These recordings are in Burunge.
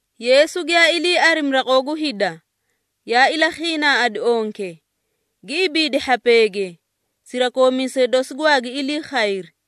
Yeesu giyaa ilii arimi raqoo gu hida, yaa ilakhiinaaꞌadi onke, gi ibiidi hhapeege. Sirakoomiisee dosi gwaagi ilii khayri.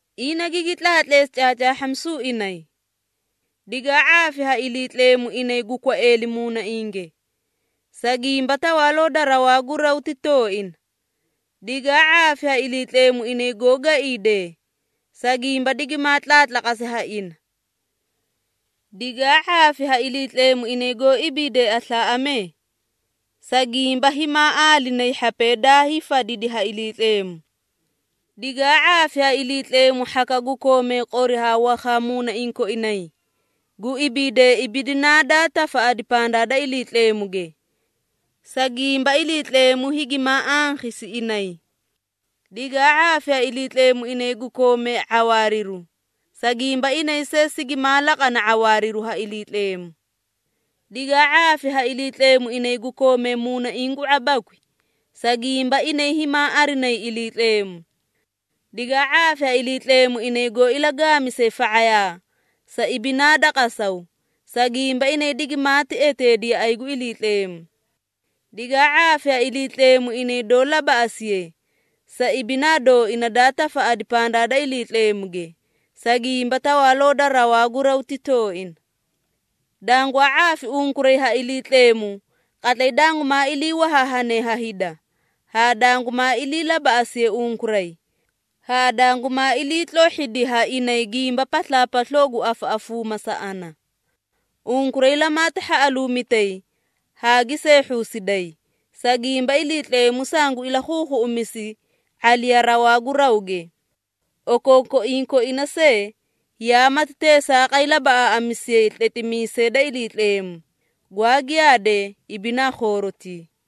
Ina gigi tlaatleesi caacaahhamisu inay. “Digaa ⁄aafi ha Iliitleemu inay gu kwaeeli muunainge, sa gimba Tawaaloo da rawaa gu raw ti tooina. Digaa ⁄aafi ha Iliitleemu inay goó gaiidee, sa gimba digimaa tlaatlaqasi ha ina. Digaa ⁄aafi ha Iliitleemu inay goó ibiidee aslaaꞌamee, sa gimba himaa aalinayi hhapee daa hiifadidi ha Iliitleemu. Digaa ⁄aafi ha Iliitleemu hhakaꞌa gu koomee qori haa wakhaa muunaiĩ koinay, gu ibiidee ibidinaa daa tafaꞌadi pandaa da Iliitleemuge, sa gimba Iliitleemu higimaa ankhisi inay. Digaa ⁄aafi ha Iliitleemu inay gu koomee ⁄awaariru, sa gimba inay see sigimaa laqana ⁄awaariru ha Iliitleemu. Digaa ⁄aafi ha Iliitleemu inay gu koomee muunaiĩ gu ⁄abakwi, sa gimba inay himaa arinayi Iliitleemu. Digaa ⁄aafi ha Iliitleemu inay goó ilagaamisee fa⁄ayaa sa ibinaa da qasaw, sa gimba inay digimaati eteedi yaꞌay gu Iliitleemu. Digaa ⁄aafi ha Iliitleemu inay doó labaꞌasiye, sa ibinaa dooina daa tafaꞌadi pandaa da Iliitleemuge, sa gimba Tawaaloo da rawaa gu raw ti tooina. Dangwaa ⁄aafi unkuray ha Iliitleemu qatlay dangumaa ilii wahaahane ha hida, haa dangumaa ilii labaꞌasiye unkuray, haa dangumaa iliitlohhidi ha inay gimba paslaapasloo gu afaꞌafuuma sa ana. Unkuray lamaati hhaꞌaluumitay haa gi seehhuusiday, sa gimba Iliitleemu sangu ilakhuukhuuꞌumisi ⁄aliya rawaa gu rawge. Okookoiĩ koina see, yaa mati teesaaqay labaꞌaaꞌamisiyay tletimiisee da Iliitleemu, gwaa giyaadee ibinaa khoorotii.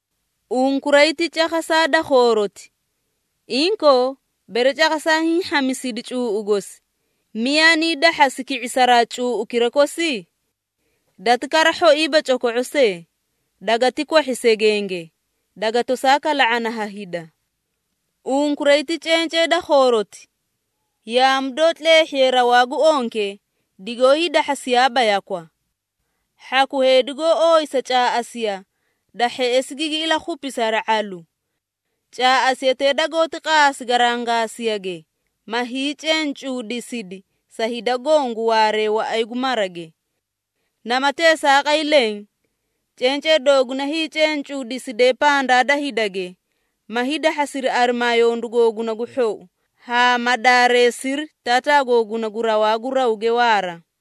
Unkuray ti cakhasaa da khooroti. Inkoo, bere cakhasaa hiĩ hhamisidi cuuꞌu gosi, miyaa nii dahhasi ki⁄isaraa cuuꞌukira kosi? Dati kara hhoiiba coko⁄o see, dagati kwahhi segenge, daga tosaa kala⁄ana ha hida. Unkuray ti cencee da khooroti. Yaamu doó tleehhiye rawaa gu onke digoó hiidahhasiyaaba yakwa. Hhaku heedi goó ooyisa caaꞌasiya, da hheꞌesi gigi ilakhupisi hari ⁄alu. Caaꞌasiyatee dagoóti qaasi garangaasiyage, ma hiicencuudisidi sa hida goõ gu waaree waꞌay gu marage. Nama teesaaqay leẽ, cencee dooguna hiicencuudiside pandaa da hidage, ma hiidahhasiri arimaa yondu googuna gu hhou, haa ma daareesiri Taataa googuna gu rawaa gu rawge waara.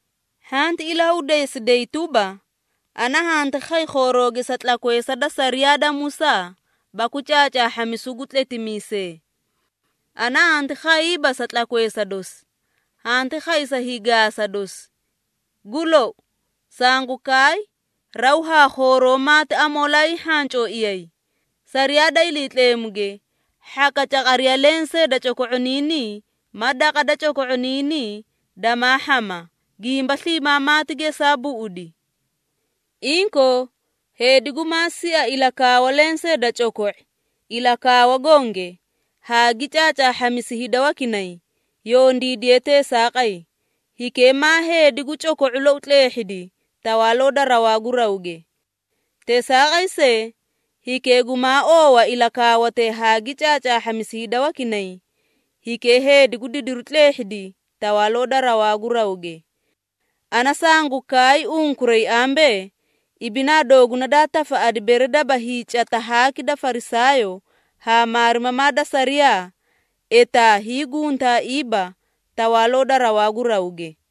Hhanti ilahudeesiday tuba, ana hanti khay khoorooge sa tlakweesa da sariyaa da Musaa baku caacaahhamisu gu tletimiisee. Ana hanti khayiiba sa tlakweesa dosi, hanti khay sa hiigaasa dosi. Gu lou, sangu kaay raw haa khooroo maati amoolaa hiihhacooiyay, sariyaa da Iliitleemuge hhaka caqariya lensee da coko⁄oniinii ma daqa da coko⁄oniinii damaa hhama, gimba sliimaa maati gesaa buꞌudi. Inkoo, heedi gumaa sia ilakaawa lensee da coko⁄i ilakaawa gonge, haa gi caacaahhamisi hida wakinay, yondiidiye teesaaqay, hikee maa heedi gu coko⁄u lou tleehhidi Tawaaloo da rawaa gu rawge. Teesaaqay see, hikee gumaa oowa ilakaawatee haa gi caacaahhamisi hida wakinay, hikee heedi gu didiru tleehhidi Tawaaloo da rawaa gu rawge. Ana sanguu kaay unkuray ambee, ibinaa dooguna daa tafaꞌadi bere daba hiicata haaki da Farisaayoo haa maarimamaa da sariyaa, etaa hiiguntaaiiba Tawaaloo da rawaa gu rawge.”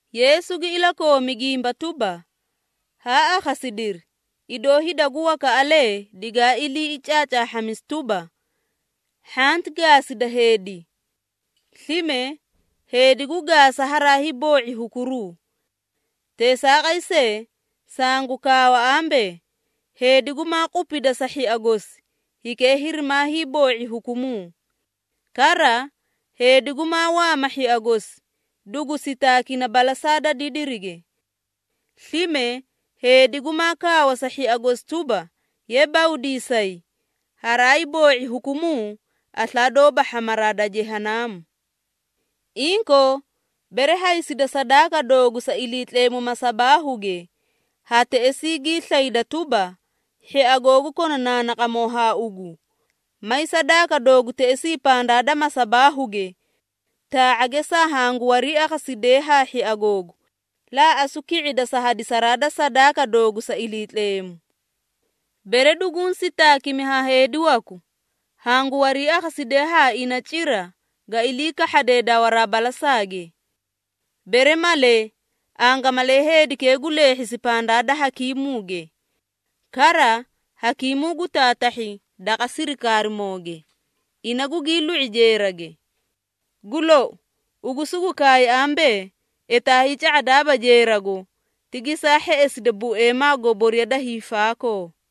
Yeesu gi ilakoomi gimba tuba, “Haa akhasidiri, idoo hida gu wakaꞌalee digaa ilii caacaahhamisi tuba, ‘Hhanti gaasida heedi! Slime, heedi gu gaasa haraa hiiboo⁄i hukuruu.’ Teesaaqay see, sangu kaawa ambee, heedi gumaa gupida sa hhia gosi, hikee hirimaa hiiboo⁄i hukumuu. Kara, heedi gumaa waama hhia gosi, dugu sitaakina balasaa da didirige. Slime heedi gumaa kaawa sa hhia gosi tuba, ‘Ye bawdiisayi,’ haraa hiiboo⁄i hukumuu aslaa doóba hhamaraa da Jehanaamu. Inkoo, bere haysida sadaaka doogu sa Iliitleemu masabaahuge, haa teꞌesii gii slayda tuba, hhia googu kona naanaqamoo haa ugu, may sadaaka doogu teꞌesii pandaa da masabaahuge. Taa⁄a geesaa hangu wariiakhasidee haa hhia googu, laaꞌasu ki⁄ida sa hadisaraa da sadaaka doogu sa Iliitleemu. Bere duguũ sitaakimi ha heedi waku, hangu wariiakhasidee haa ina cira ga ilii kahhadee dawaraa balasaage. Bere malee, angamalee heedikee gu leehhisi pandaa da hakiimuuge. Kara, hakiimuu gu taatahhi daqa sirikaarimooge, ina gugii lu⁄i jeerage. Gu lou, ugu sugu kaay ambee, etaa hiica⁄adaaba jeerago, ti geesaa hheꞌesida bueemaa goboriya da hiifaakoo!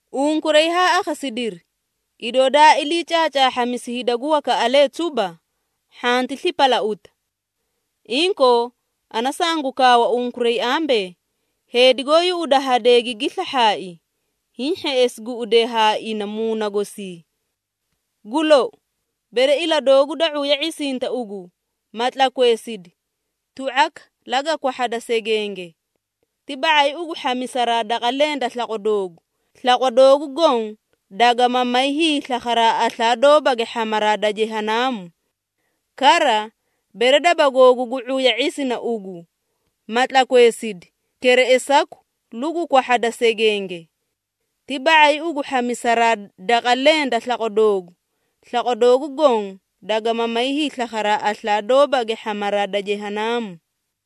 Unkuray haa akhasidiri, idoo daa ilii caacaahhamisi hida gu wakaꞌalee tuba, ‘Hhanti slipalauta.’ Inkoo, ana sangu kaawa unkuray ambee, heedi goó yuꞌuda hadee gigi slahhaai, hiĩ hheꞌesi guꞌudee haa ina muuna gosii. Gu lou, bere ila doogu da ⁄uya ⁄isinta ugu, ma tlakweesidi, tu⁄aka laga kwahhada segenge. Ti ba⁄ay ugu hhamisaraa daqa leẽ da slaqwa doogu, slaqwa doogu goõ dagama may hiislakharaa aslaa doobage hhamaraa da Jehanaamu. Kara, bere daba googu gu ⁄uya ⁄isina ugu, ma tlakweesidi, kereꞌesaku lugu kwahhada segenge. Ti ba⁄ay ugu hhamisaraa daqa leẽ da slaqwa doogu, slaqwa doogu goõ dagama may hiislakharaa aslaa doobage hhamaraa da Jehanaamu.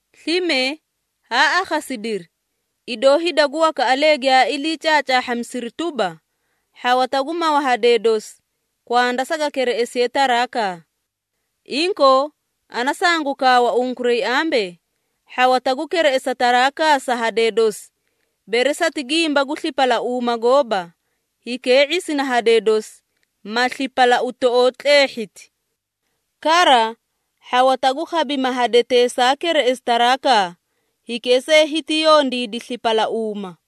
Slime haa akhasidiri, idoo hida gu wakaꞌalee giyaa ilii caacaahhamisiri tuba, ‘Hhawata gu mawa hadee dosi, kwanda saga kereꞌesiye tarakaa.’ Inkoo, ana sangu kaawa unkuray ambee, hhawata gu kereꞌesa tarakaa sa hadee dosi, bere sati gimba gu slipalauuma gooba, hikee ⁄isina hadee dosi, ma slipalauutoꞌoo tleehhiti. Kara, hhawata gu khabima hadetee saa kereꞌesi tarakaa, hikee see hiti yondiidi slipalauuma.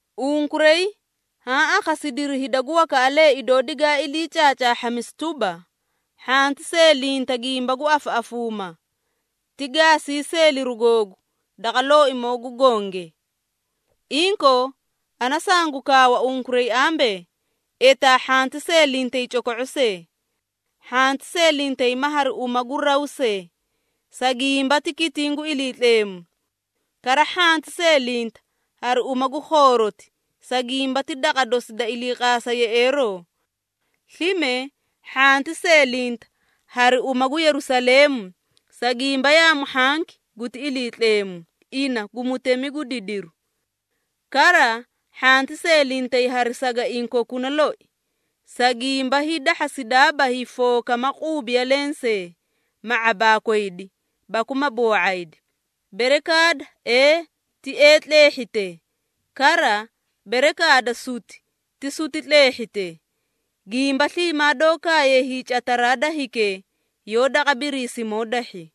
Unkuray haã akhasidiri hida gu wakaꞌalee idoo digaa ilii caacaahhamisi tuba, ‘Hhanti seelinta gimba gu afaꞌafuuma, ti gaasii seeliru googu daqa Looimoo gu Gonge.’ Inkoo, ana sangu kaawa unkuray ambee, etaa hhanti seelintay coko⁄o see. Hhanti seelintay ma hari uma gu raw see, sa gimba ti kitiĩ gu Iliitleemu. Kara, hhanti seelinta hari uma gu khooroti, sa gimba ti daqa dosi da iliiqaasa yeꞌeeroo. Slime, hhanti seelinta hari uma gu Yerusaleemu, sa gimba yaamu hhanki guti Iliitleemu, ina gu Mutemi gu didiru. Kara, hhanti seelintay hari sagaiĩ kokuna loi, sa gimba hiidahhasidaaba hiifooka ma quubiya lensee, ma ⁄abaakwaydi baku ma boo⁄aydi. Bere kaada, ‘Ee’ ti ‘Ee’ tleehhite. Kara, bere kaada, ‘Suti’ ti ‘Suti’ tleehhite. Gimba sliimaa doó kaaye hiicataraa da hikee, yoó daqa Biriisimoo dahhi.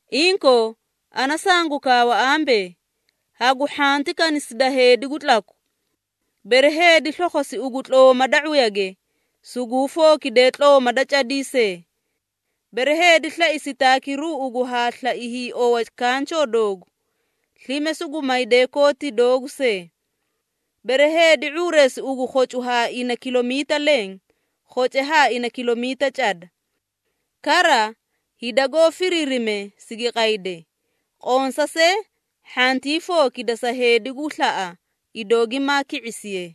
Inkoo, ana sangu kaawa ambee, hagu hhanti kanisida heedi gu tlaku. Bere heedi slokhosi ugu tlooma da ⁄uyage, suguu fookide tlooma da cadii see. Bere heedi slai sitaakiru ugu haa slai hiiowa kanchoo doogu, slime sugu mayde kooti doogu see. Bere heedi ⁄uureesi ugu khocu haa ina kilomiita leẽ, khoce haa ina kilomiita cada. Kara, hida goó firiirimee sigi qaydee, qonsa see hhantii fookida sa heedi gu slaꞌa idoo gimaa ki⁄isiye.”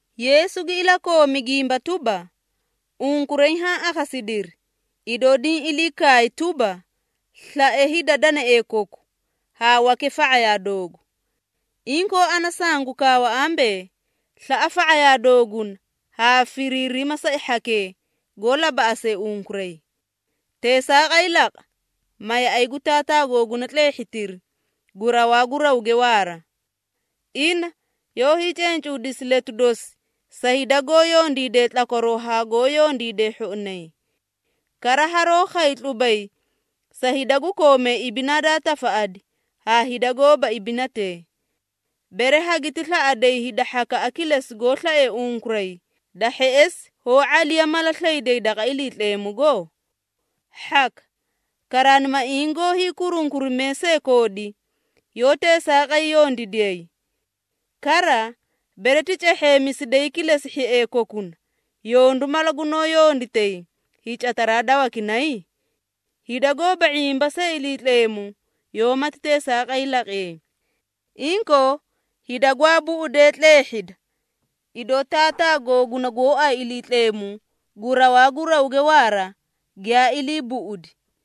Yeesu gi ilakoomi gimba tuba, “Unkuray haã akhasidiri, idoo diĩ ilii kaay tuba, ‘Slae hida danaee koku,’ haa wake fa⁄ayaa doogu. Inkoo, ana sangu kaawa ambee, slaꞌa fa⁄ayaa dooguna haa firiirima sa hhakee goó labaꞌasee unkuray. Teesaaqay laqa, ma yaꞌay gu Taataa googuna tleehhitiri gu rawaa gu rawge waaraa. Ina yoó hiicencuudisi letu dosi sa hida goó yondiidee tlakwaroo haa goó yondiidee hhoinay. Kara, haroó khay tlubay sa hida gu koome ibinaa daa tafaꞌadi haa hida gooba ibinatee. Bere hagiti slaꞌaday hida hhakaꞌa kilesi goó slaee unkuray, da hheꞌesi hoó ⁄aliya mala slayday daqa Iliitleemugo? Hhaka! Karaanimaiĩ goó hiikurunkurimee see koodi, yoó teesaaqay yondiidiyay! Kara, bere ti cehheemisiday kilesi hhiee kokuna, yondu mala gunoó yonditay hiicataraa da wakinay? Hida goóba ⁄imba see Iliitleemu yoómati teesaaqay laqiyay! Inkoo, hida gwaa buꞌudee tleehhida, idoo Taataa googuna gooay Iliitleemu gu rawaa gu rawge waara giyaa ilii buꞌudi.”